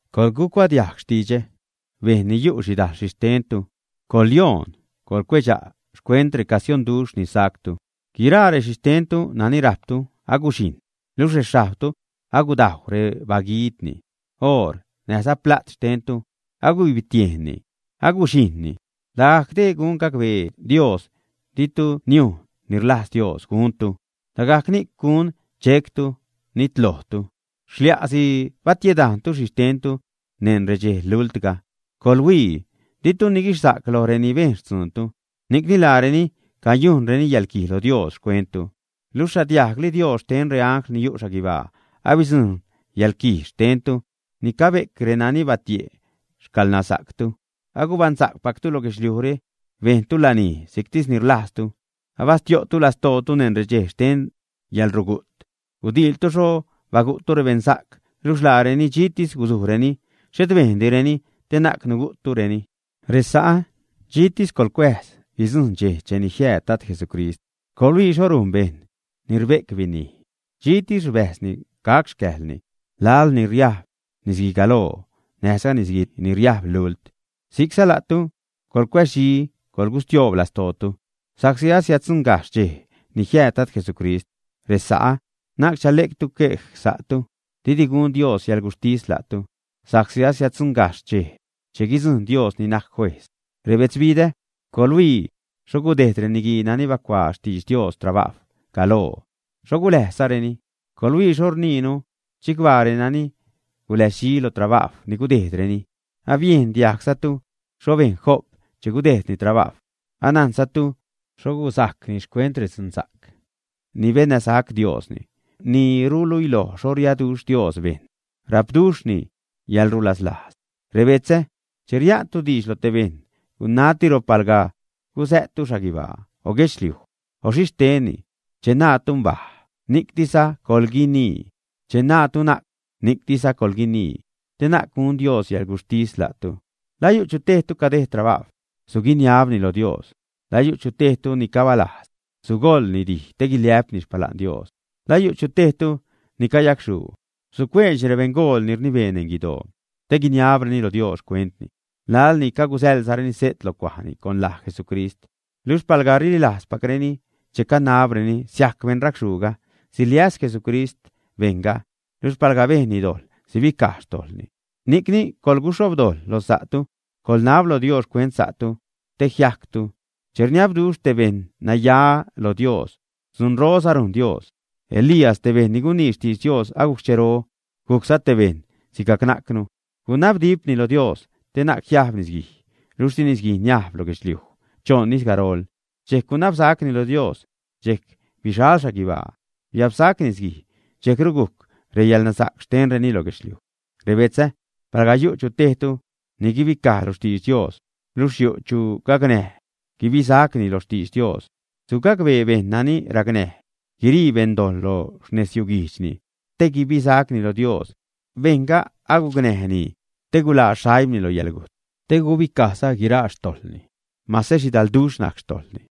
Coḻgucuadiajg xtidxä, bejṉ ni yu' xhidajl xhixtentu. Coḻyoon, coḻcuedxa' xcuent recasionduxh ni sactu. Guiraa rexhixtentu nani rajptu aguxhijṉ, luxh rexhajbtu agudajw rebaguiidni. Oor näjza pla't xtentu agubibtiejnni, aguxhijṉni. Lagajc dee gun gacbee Dios ditu niujn ni rlajz Dios guntu, lagajc ni'c gun chectu, nitlojtu. ¡Xlia'si batiedajntu xhixtentu neṉ redxej lultga! ¡Coḻhuii! Ditu niguixsa'c loj reni bejn xtzuuntu, ni'cni laareni cayujnreni yäḻquij lo Dios xcuenttu. Luxh xhadiajgli Dios xten reangl ni yu' xhaguibaa abidzujṉ yäḻquij xtentu ni cabe'c renani batie' xcäḻnasa'ctu. Agubaṉsa'cpactu lo guedxliujre, bejntu lanij si'ctis ni rlajztu, abastio'tu lastootu neṉ redxej xten yäḻrugu't. Gudiiltu xho bagu'ttu rebeṉsa'c luxh laareni dxiitis gusujreni, xhet bejndireni te na'c nugu'ttureni. Resa'ä, dxitis coḻcuääz guidzujṉ dxej cheni jiääd Dad Jesucrist. Coḻhuii xho rujn bejṉ ni rbe'c binij, dxitis rbäjzni gac xcäjlni laḻ ni riajb nisguigaloo näjza nisguij ni riajb lult. Si'cza la'tu coḻcuäzdxi, coḻgustioob lastootu sa'csi asiäddzuṉgajxh dxej ni jiääd Dad Jesucrist. Resa'ä, na'c chale'ctu xquej sa'tu, didi gun Dios yäḻguxhtis la'tu, sa'csi asiäddzuṉgajxh dxej che guidzujṉ Dios ni najc Juejz. Rebetzbidä, coḻhuii xho gudejd reniguii nani bacuaa xtidx Dios trabajw galoo, xho guläjzzareni. Coḻhuii xho rniinu chicbaa renani guläzdxi lo trabajw ni gudejdreni. Abiejn diajgzatu xho bejn Job che gudejdni trabajw, anajnzatu xho guzajcni xcuent redzunsa'c ni bennäsac Diosni, ni ruluiloj xho riaduxh Dios bejṉ, rapduxhni yäḻrulaslajz. Rebetzä, che ria'ntu diidx lo te bejṉ, gunatiro palga gusä'ttu xhaguibaa, o guedxliuj, o xhi steeni. Che naatu: “Mbaj”, ni'ctisza coḻguinii. Che naatu: “Na'c”, ni'ctisza coḻguinii te na'c gun Dios yäḻguxhtis la'tu. ¿La yu' tejtu ni cadejd trabajw, ä? Suguiniabni lo Dios. ¿La yu' chu tejtu ni cabalajz, ä? Sugoḻni dij te guiliä'pni xpala'n Dios. ¿La yu' chu tejtu ni cayacxhuu, ä? Sucueedxni rebeṉgool ni rnibee neṉ guidoo, te guiniabreni lo Dios xcuentni laḻ ni cagusäḻzareni se't lo cuajni con laj Jesucrist. Luxh palga rililajzpacreni che canabreni, siajc beṉracxhuuga, siliäs Jesucrist bejṉga. Luxh palga bejnni dojḻ, sibicaj xtojḻni. Ni'cni coḻguxhobdojḻ lo sa'tu, coḻnab lo Dios xcuent sa'tu te jiajctu. Che rniabduxh te beṉ naya lo Dios, dzunroza rujn Dios. Elías, te bejṉ ni gunii xtidx Dios agujc xchero, gujcza te bejṉ sigajc najcnu. Gunabdipni loj Dios te na'c jiajb nisguij, luxh di nisguij niajb lo guedxliuj choṉ ijz garol. Dxejc gunabsacni lo Dios, dxejc bixal xhaguibaa, biabsac nisguij, dxejcru gujc reyäḻnasa'c xtenreni lo guedxliuj. Rebetzä, palga yu' chu tejtu ni guibicaj lo xtidx Dios, luxh yu' chu gacnäj guibisacni lo xtidx Dios, sugacbee bejṉ nani racnäj guirii beṉdojḻ lo xnezyuguijdxni te guibisacni lo Dios, bejṉga agucnäjni te guḻaa xaimni lo yäḻgujt, te gubicajza guiraa xtojḻni, mase xhidalduxh najc xtojḻni.